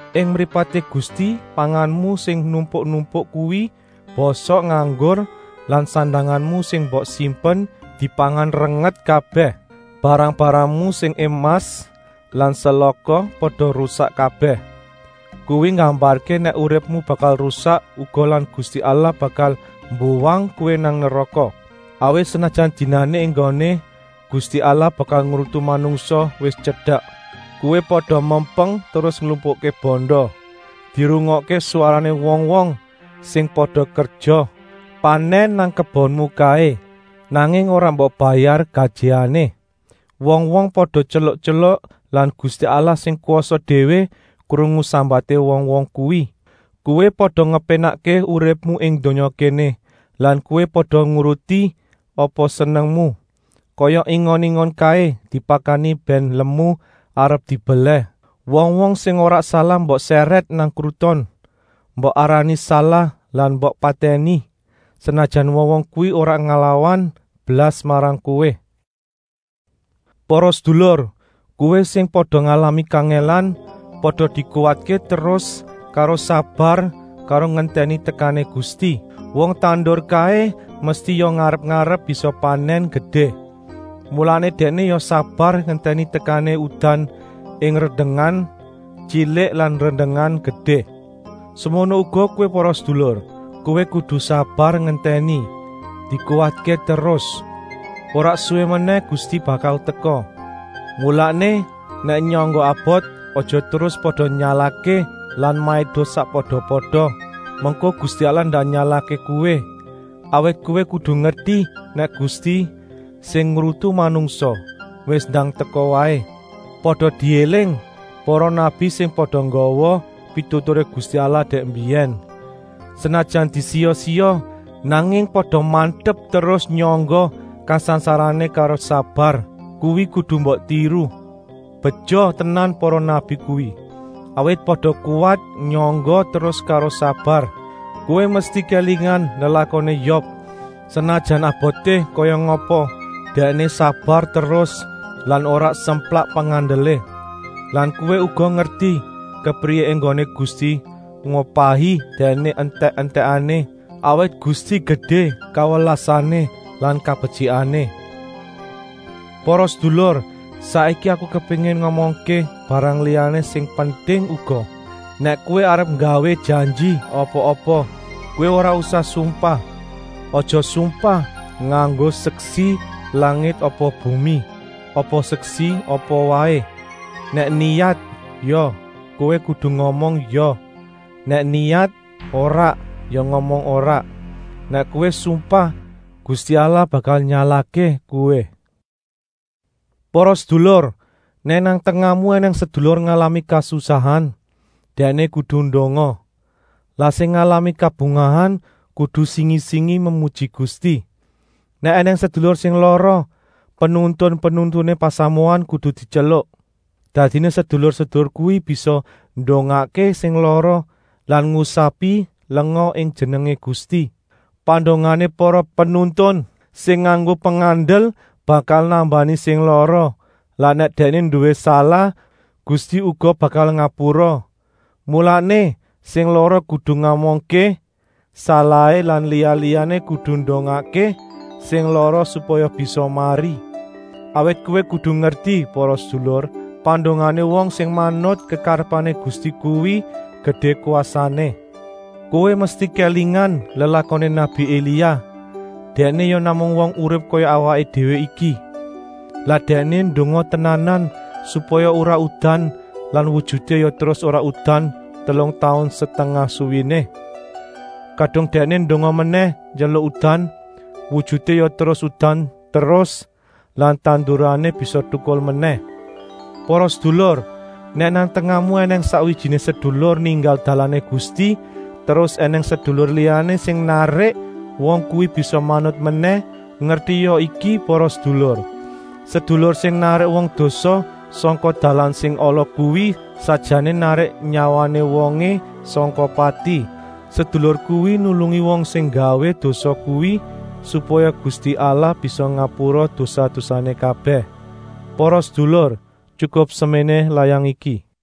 Ing mripaté Gusti panganmu sing numpuk-numpuk kuwi bosok nganggur lan sandanganmu sing mbok simpen dipangan renget kabèh. Barang-barangmu sing emas lan selaka pada rusak kabèh; kuwi nggambarké nèk uripmu bakal rusak uga lan Gusti Allah bakal mbuwang kowé nang neraka, awit senajan dinané enggoné Gusti Allah bakal ngrutu manungsa wis tyedek, kowé pada mempeng terus nglumpukké banda. Dirungokké swarané wong-wong sing pada kerja panèn nang kebonmu kaé, nanging ora mbok bayar gajihané. Wong-wong pada tyeluk-tyeluk lan Gusti Allah sing kwasa déwé krungu sambaté wong-wong kuwi. Kowé pada ngepénakké uripmu ing donya kéné lan kowé pada nuruti apa senengmu, kaya ingon-ingon kaé dipakani bèn lemu arep dibelèh. Wong-wong sing ora salah mbok sèrèt nang kruton, mbok arani salah lan mbok patèni, senajan wong-wong kuwi ora nglawan blas marang kowé. Para sedulur, kowé sing pada ngalami kangèlan, pada dikuwatké terus karo sabar karo ngentèni tekané Gusti. Wong tandur kaé mesti ya ngarep-arep bisa panèn gedé. Mulané dèkné ya sabar ngentèni tekané udan ing rendengan tyilik lan rendengan gedé. Semono uga kowé para sedulur, kowé kudu sabar ngentèni. Dikuwatké terus! Ora suwi menèh Gusti bakal teka. Mulané, nèk nyangga abot, aja terus pada nyalahké lan maido sakpada-pada, mengko Gusti Allah ndak nyalahké kowé. Awit kowé kudu ngerti nèk Gusti, sing ngrutu manungsa, wis ndang teka waé. Pada diéling para nabi sing pada nggawa pituturé Gusti Allah dèk mbiyèn. Senajan disiya-siya, nanging pada mantep terus nyangga kasangsarané karo sabar. Kuwi kudu mbok tiru. Beja tenan para nabi kuwi, awit pada kuwat nyangga terus karo sabar. Kowé mesti kélingan lelakoné Yob, senajan aboté kaya ngapa, dèkné sabar terus lan ora semplak pengandelé. Lan kowé uga ngerti kepriyé enggoné Gusti ngupahi dèkné entèk-entèkané, awit Gusti gedé kawelasané lan kabetyikané. Para sedulur, saiki aku kepéngin ngomongké barang liyané sing penting uga. Nèk kowé arep nggawé janji apa-apa, kowé ora usah sumpah. Aja sumpah nganggo seksi langit apa bumi, apa seksi apa waé. Nèk niyat “ya” kowé kudu ngomong “ya” nèk niyat “ora” ya ngomong “ora.” Nèk kowé sumpah, Gusti Allah bakal nyalahké kowé. Para sedulur, nèk nang tengahmu ènèng sedulur ngalami kasusahan, dèkné kudu ndonga. Lah sing ngalami kabungahan kudu singi-singi memuji Gusti. Nèk ènèng sedulur sing lara, penuntun-penuntuné pasamuan kudu dityeluk. Dadiné sedulur-sedulur kuwi bisa ndongakké sing lara lan ngusapi lenga ing jenengé Gusti. Pandongané para penuntun sing nganggo pengandel bakal nambani sing lara lan nèk dèkné nduwé salah, Gusti uga bakal ngapura. Mulané, sing lara kudu ngomongké salahé lan liya-liyané kudu ndongakké sing lara supaya bisa mari. Awit kowé kudu ngerti para sedulur, pandongané wong sing manut kekarepané Gusti kuwi gedé kwasané. Kowé mesti kélingan lelakoné nabi Elia. Dèkné ya namung wong urip kaya awaké déwé iki. Lah dèkné ndonga tenanan supaya ora udan lan wujuté ya terus ora udan telung taun setengah suwéné. Kadung dèkné ndonga menèh njaluk udan, wujuté ya terus udan terus lan tandurané bisa tukul menèh. Para sedulur, nèk nang tengahmu ènèng sakwijiné sedulur ninggal dalané Gusti terus ènèng sedulur liyané sing narik wong kuwi bisa manut menèh, ngertia iki para sedulur: sedulur sing narik wong dosa sangka dalan sing ala kuwi sakjané narik nyawané wongé sangka pati. Sedulur kuwi nulungi wong sing nggawé dosa kuwi, supaya Gusti Allah bisa ngapura dosa-dosané kabèh. Para sedulur, tyukup seméné layang iki. Yakobus